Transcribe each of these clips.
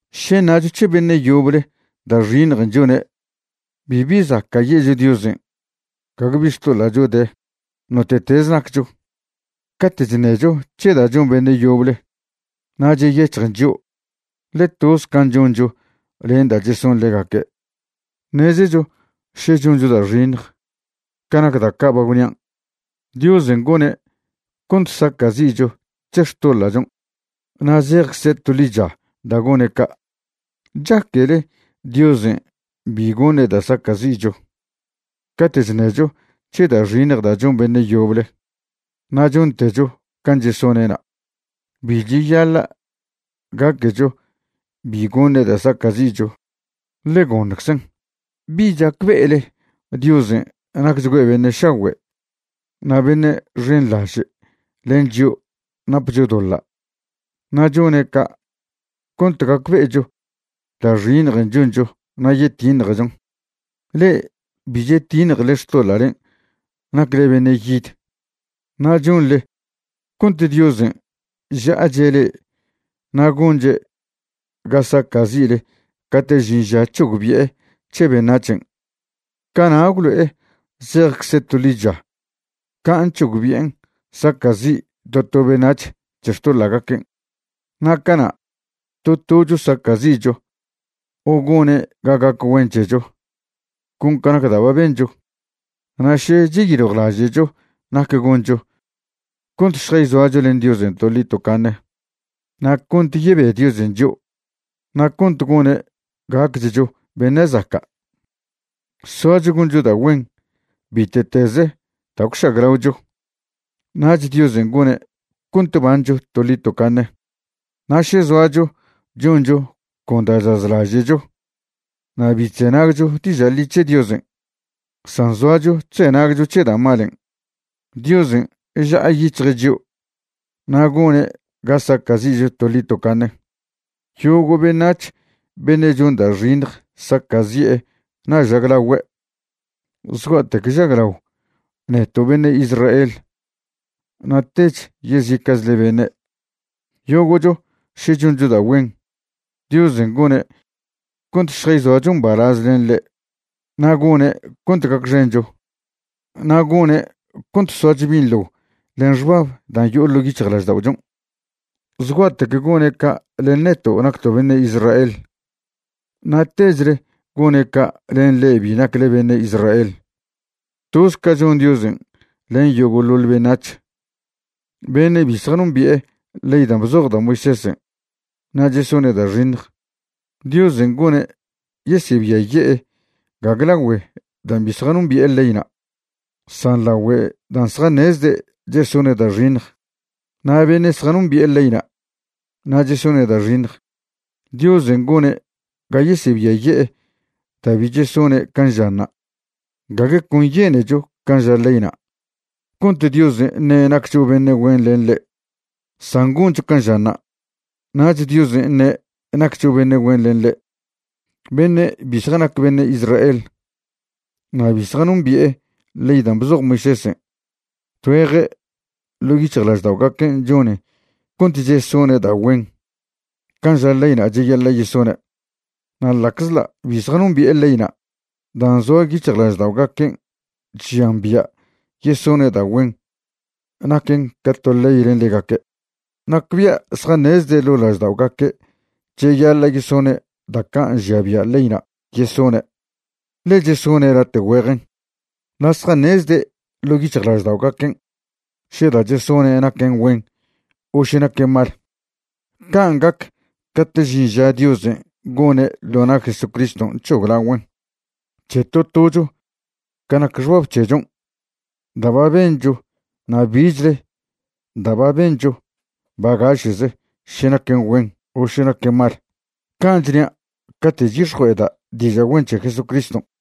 Še ṉacho c̱he beṉe' yoble da' xiṉjen' chone', bibi zaca' ye'cho Diosen' gague bi xtoḻa'cho de, note'tez naccho. Cate' chṉecho c̱he da' chon beṉe' yoble, na' cheyec̱hjen chio', ḻe toz can' choncho len da' cheson ḻegaque'. Ṉezecho še choncho da' xiṉj ca nac da' ca' ba gwnian', Diosen' gone' cont saca'zi'cho c̱he xtoḻa'chon' na' zejcze' to ḻicha da' gone' ca'. ¿Chaquele Diosen' bi goṉe' da' saca'zi'cho cate' chṉecho c̱he da' xiṉj da' chon beṉe' yoble na' chontecho can' chesone'na'? Bi cheyaḻa' gaquecho bi goṉe' da' saca'zi'cho, ḻe goṉczen'. ¿Bi chacbe'ele Diosen' nacchgüe' beṉe' šagüe' na' beṉe' xenḻaže' len chio' napcho doḻa' na' chone' ca' cont gacbe'echo da' xiṉjen' choncho na' yetiṉjechon? Le'e bi chetiṉjele xtoḻa'len' nacle beṉe' yid, na' chonḻe cont Diosen' ža'ache' le'e na' gonche' ga saca'zi'le cate' žin ža c̱hogbi'e c̱he beṉac̱hen'. Cana' gwlo'e zejcze' to ḻicha can' c̱hogbi'en saca'zi' to to beṉac̱h c̱he xtoḻa'gaquen'. Na' cana' to tocho saca'zi'cho o gone' ga gac güen c̱hecho con ca nac da' ba bencho. Na' še cheyiljwlaže'cho nac goncho cont šjayzoacho len Diosen' toḻi tocaṉe, na' cont yebe Diosen' chio', na' cont gone' gacchcho beṉe' zaca', soacho goncho da' güen bite'teze da' gwžaglaocho. Nach Diosen' gone' cont bancho toḻi tocaṉe. Na' še zoacho choncho con da' chazlaže'cho na' bi chzenagcho diža' ḻi c̱he Diosen', san zoacho chzenagcho c̱he da' malen', Diosen' ža'ayic̱hje' chio' na' gone' ga saca'zi'cho toḻi tocaṉe. Yogo' beṉac̱h beṉe' chon da' xiṉj saca'zi'e na' žaglagüe', zgua'tec žaglao neto' beṉe' Israel na' tech yezica'chle beṉe'. Yogo'cho še choncho da' güen, Diosen' gone' cont šjayzoacho mbalaz len ḻe' na' gone' cont gacxencho, na' gone' cont soacho binḻo len xbab dan' yo'o ḻo' yic̱hjlažda'ochon'. Zgua'tec gone' ca' len neto' nacto' beṉe' Israel, na' techle gone' ca' len le'e bi nacle beṉe' Israel. Toz ca chon Diosen' len yogo'ḻoḻ beṉac̱h. Beṉe' bi zjanombi'e ley dan' bzoj da' Moisésen' na' chesone' da' xiṉj, Diosen' gone' yesebiaye'e gague lagüe dan' bi zjanombi'e leyna', san lagüe dan' zjaṉezde' chesone' da' xiṉj. Na' beṉe' zjanombi'e leyna' na' chesone' da' xiṉj, Diosen' gone' ga yesebiaye'e da' bi chesone' can' žanṉa'. Gague con yenecho can' ža leyna' cont Diosen' ṉe' naccho beṉe' güen len ḻe', san goncho can' žanṉa', nach Diosen' ṉe' naccho beṉe' güen len ḻe'. Beṉe' bi zjanac beṉe' Israel na' bi zjanombi'e ley dan' bzoj Moisésen', tgüeje ḻo' lažda'ogaquen' chonen cont chesone' da' güen can' ža leyna' cheyaḻa' yesone', na' ḻa'czḻa' bi zjanombi'e leyna' dan' zoa yic̱hjlažda'ogaquen' chžian bia' yesone' da' güen, naquen ca to ley len ḻegaque'. Nacbia' zjaṉezde' ḻo' lažda'ogaque' cheyaḻa' yesone' da' ca' nžia bia' leyna' yesone', ḻe chesone' late' güejen. Na' zjaṉezde' ḻo' yic̱hjlažda'ogaquen' še da' chesone' naquen güen o še naquen mal. Can' gac caten' žin ža Diosen' gone' ḻo na' Jesucriston' c̱hoglagüen' c̱he to tocho ca nac xbab c̱hechon' da' ba bencho na' bichle da' ba bencho bagaše'ze še naquen güen o še naquen mal. Can' chnia' cate' chyix̱jue'eda' diža' güen c̱he Jesucriston'.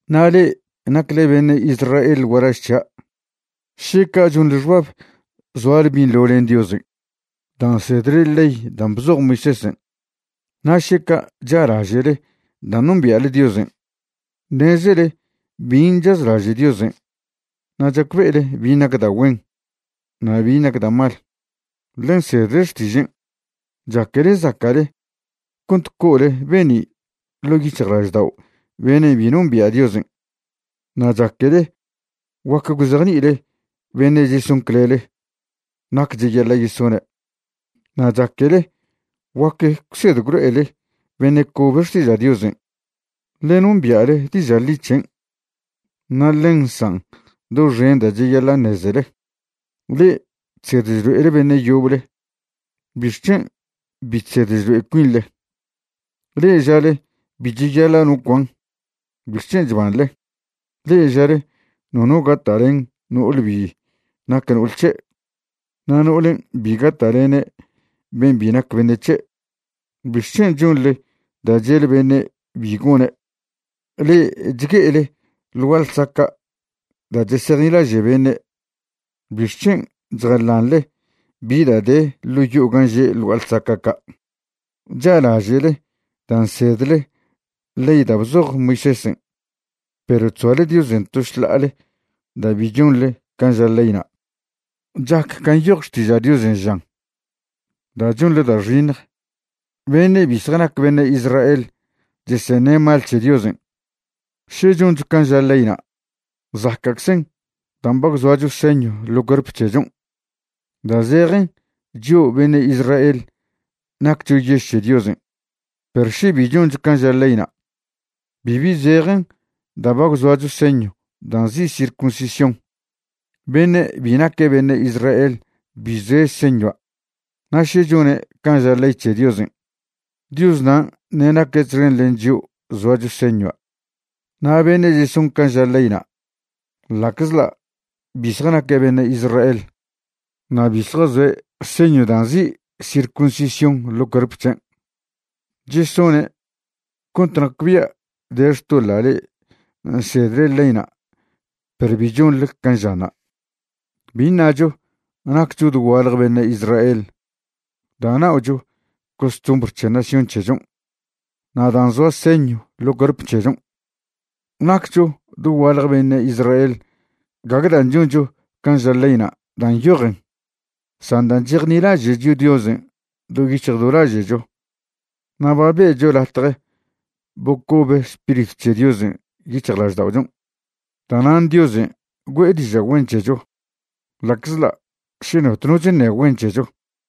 Na' le'e nacle beṉe' Israel gualaž c̱hia', šeca chonḻe xbab zoale binḻo len Diosen' da' nsedle ley dan' bzoj Moisésen', na' šeca cha'laže'le dan' nombia'le Diosen'. Ṉezele bin' chazlaže' Diosen' na' chacbe'ele bin' nac da' güen na' bin' nac da' mal, ḻe nsedle xtižen'. Chaquele zaca'le cont co'ole be'ni' ḻo' yic̱hjlaždao' beṉe' bi nombia' Diosen'. Na' chaquele guac gwzejni'ile beṉe' cheson clele nac cheyaḻa' yesone', na' chaquele guac gwsed gwlo'ele beṉe' cobe xtiža' Diosen', ḻe nombia'le diža' ḻi c̱hen' na' ḻen nsan' doxen da' cheyaḻa' ṉezele. Le'e chsed chlo'ele beṉe' yoble, ¿bixc̱hen' bi chsed chlo'e cuinḻe? Le'e žale bi cheyaḻa' no cuan, ¿bixc̱hen' chbanḻe? Le'e žale nono gata'len no'ole bi nac no'ol c̱he', na' no'olen' bi gata'lene' ben' bi nac beṉe' c̱he', ¿bixc̱hen' chonḻe da' che'le beṉe' bi gone'? Le'e chgue'ele ḻ gua'a ḻsaca' da' chesejnilaže' beṉe' ¿bixc̱hen' chjalanḻe bi da' de ḻo' yo'o gan' že' ḻ gua'a ḻsaca' ca'? Cha'laže'le da' nsedle ley da' bzoj Moisésen', perw chzoale Diosen' to šḻa'ale da' bi chonḻe can' ža leyna'. Chac can' nyoj Xtiža' Diosen' žan: “Da' chonḻe da' xiṉj, beṉe' bi zjanac beṉe' Israel cheseṉe' mal c̱he Diosen'.” Še choncho can' ža leyna' zaca'czen dan' ba gwzoacho señw ḻo cuerp c̱hechon' da' zejen chio' beṉe' Israel naccho yež c̱he Diosen'. Perw še bi choncho can' ža leyna', bibi zejen da' ba gwzoacho señw dan' nzi' circuncisión. Beṉe' bi naque' beṉe' Israel bi zoe' señua', na' še chone' can' ža ley c̱he Diosen', Diosnan' ṉe' naque' txen len chio' zoacho señua'. Na' beṉe' cheson can' ža leyna', ḻa'czḻa' bi zjanaque' beṉe' Israel na' bi zjazoe' señw dan' nzi' circuncisión ḻo cuerp c̱hen', chesone' cont nacbia' de xtoḻa' le'e nsedle leyna' perw bi chonḻe can' žanṉa'. Bi ṉacho nacccho dogualje beṉe' Israel da' na'ocho costumbr c̱he nación c̱hechon' na' dan' zoa señw ḻo cuerp c̱hechon'. Naccho dogualje beṉe' Israel gague dan' choncho can' ža leyna' da' nyojen, san da' chejnilaže'cho Diosen' do yic̱hj do laže'cho na' ba be'cho latje bocobe Spiritw c̱he Diosen' yic̱hjlažda'ochon'. Da'nan' Diosen' güe'e diža' güen c̱hecho, ḻa'czḻa' še notno chṉe güen c̱hecho.